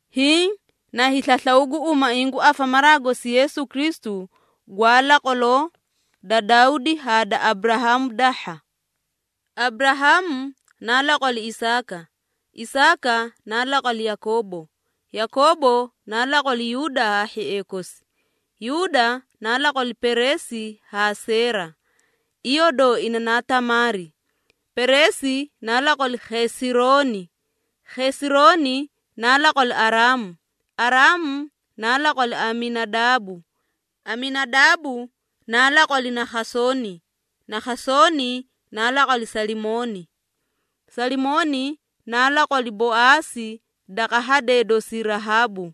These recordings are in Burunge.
Hiĩ na hiislaslaw gu umaiĩ gu afamaraa gosi Yeesu Kristu gwa laqwaloo da Dawdi haa da Aburahaamu dahha. Aburahaamu naa laqwali Isaaka, Isaaka naa laqwali Yakoobo, Yakoobo naa laqwali Yuuda haa hhiee kosi, Yuuda naa laqwali Pereesi haa Seera, iyoo dooina naa Tamaari. Pereesi naa laqwali Khesirooni, Khesirooni naa laqwali Araamu. Araamu naa laqwali Aminadaabu, Aminadaabu naa laqwali Nakhasooni, Nakhasooni naa laqwali Salimooni. Salimooni naa laqwali Boaasi daqa hadee dosii Rahaabu,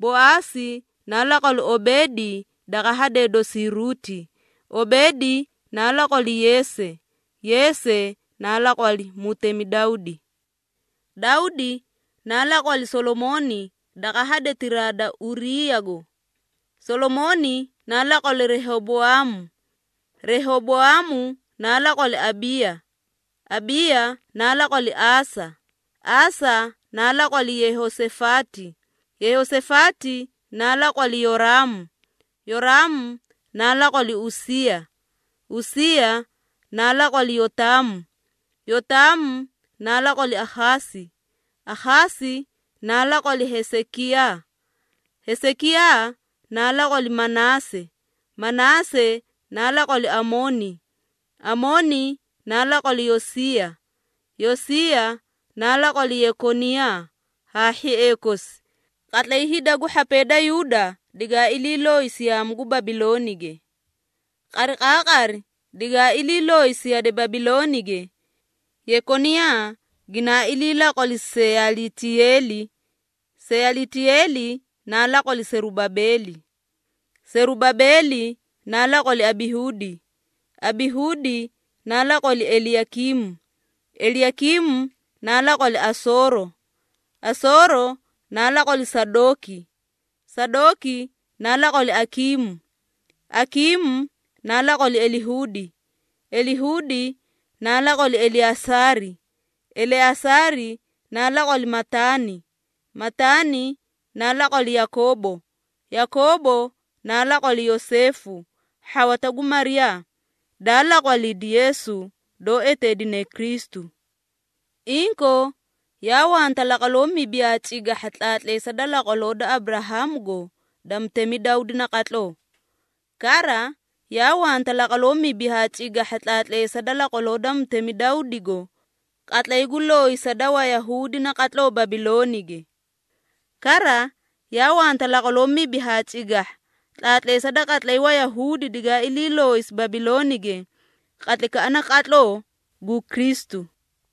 Boaasi naa laqwali Obeedi daqa hadee dosii Ruuti, Obeedi naa laqwali Yeese. Yeese naa laqwali mutemi Dawdi. Dawdi naa laqwali Solomooni daqa hadetiraa da Uriiyago. Solomooni naa laqwali Rehoboaamu, Rehoboaamu naa laqwali Abiiya, Abiiya naa laqwali Aasa. Aasa naa laqwali Yehosafaati, Yehosafaati naa laqwali Yoraamu, Yoraamu naa laqwali Usiiya. Usiiya naa laqwali Yotaamu, Yotaamu naa laqwali Akhaasi, Akhaasi naa laqwali Hesekiyaa. Hesekiyaa naa laqwali Manaase, Manaase naa laqwali Amooni, Amooni naa laqwali Yosiiya. Yosiiya naa laqwali Yekoniyaa haa hhiee kosi, qatlay hida gu hhapee da Yuuda digaa ilii looyisi yaamu gu Babiloonige. Qariqaaqari digaa ilii looyisi yade Babiloonige, Yekoniyaa ginaa ilii laqwali Seyalitiyeeli, Seyalitiyeeli naa laqwali Serubabeeli, Serubabeeli naa laqwali Abihuudi, Abihuudi naa laqwali Eliyakiimu, Eliyakiimu naa laqwali Asooro, Asooro naa laqwali Sadooki, Sadooki naa laqwali Akiimu, Akiimu naa laqwali Elihuudi, Elihuudi naa laqwali Eleasaari, Eleasaari naa laqwali Mataani, Mataani naa laqwali Yakoobo, Yakoobo naa laqwali Yoseefu, hhawata gu Mariyaa, daa laqwalidi Yeesu, doó eteedine Kristu. Inkoo, yaa wanta laqwaloo mibi haa cigahha tlaatleesa da laqwaloo da Aburahaamugo da mutemi Dawdi naqatloo. Kara, yaa wanta laqwaloo mibi haa cigahha tlaatleesa da laqwaloo da mutemi Dawdigo qatlay gu looyisa da Wayahuudi naqatloo Babiloonige. Kara, yaa wanta laqwaloo mibi haa cigahha tlaatleesa da qatlay Wayahuudi digaa ilii looyisi Babiloonige qatlaykaꞌa naqatloo gu Kristu.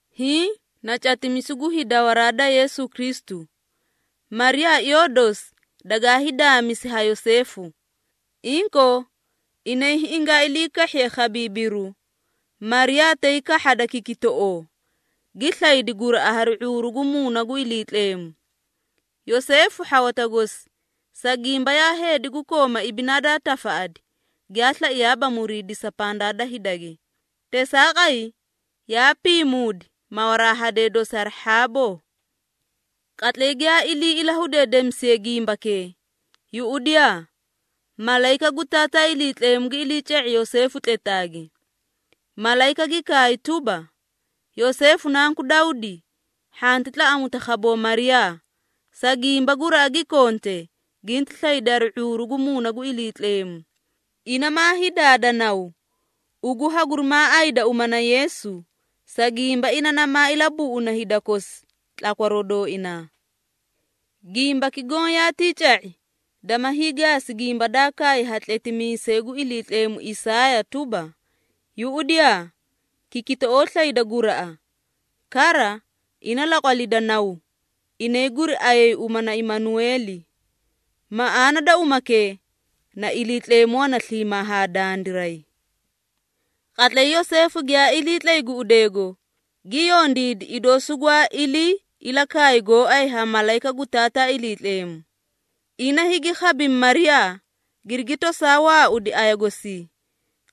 Hiĩ na catimisu gu hiidawaraa da Yeesu Kristu. Mariyaa iyoo dosi dagaa hiidaamisi ha Yoseefu. Inkoo, inay hingaa ilii kahhiye khabiibiru, Mariyaa tay kahhada kikitoꞌoo, gi slaydi guraꞌa hari ⁄uuru gu Muuna gu Iliitleemu. Yoseefu, hhawata gosi, sa gimba yaa heedi gu kooma ibinaa daa tafaꞌadi, giyaa slaiyaaba muriidisa pandaa da hidage. Teesaaqay, yaa piimuudi mawaraa hadee dosi hari hhaaboo. Qatlay giyaa ilii ilahudeedemisiye gimbakee, yuꞌudiyaa malayika gu Taataa Iliitleemu gi iliica⁄i Yoseefu tletaage. Malayika gi kaay tuba, “Yoseefu nanku Dawdi, hhanti tlaꞌamuta khaboo Mariyaa, sa gimba guraꞌa gi konte, ginti slaydi hari ⁄uuru gu Muuna gu Iliitleemu. Ina maa hiidaada naw, ugu hagurimaa ayida uma na Yeesu, sa gimba ina namaa ilabuꞌuna hida kosi tlakwaroo dooinaa.” Gimbaki goõ yaatii ca⁄i, dama hiigaasi gimba daa kaay ha tletimiisay gu Iliitleemu Isaaya tuba, “Yuꞌudiyaa! Kikitoꞌoo slayda guraꞌa. Kara, ina laqwalida naw, inay guriayay uma na Imanueeli.” Maꞌaana da umakee na “Iliitleemu wana sliimaa haa dandiray.” Qatlay Yoseefu giyaa iliitlay guꞌudeego, gi yondiidi idoo sugwaa ilii ilakaay gooay ha Malayika gu Taataa Iliitleemu. Ina higi khabimi Mariyaa, girigi tosaa waaudi aya gosii.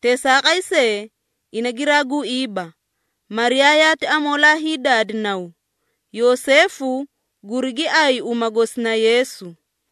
Teesaaqay see, ina giraa guiiba, Mariyaa yaati amoolaa hiidaadi naw. Yoseefu gurigi ayi uma gosi na Yeesu.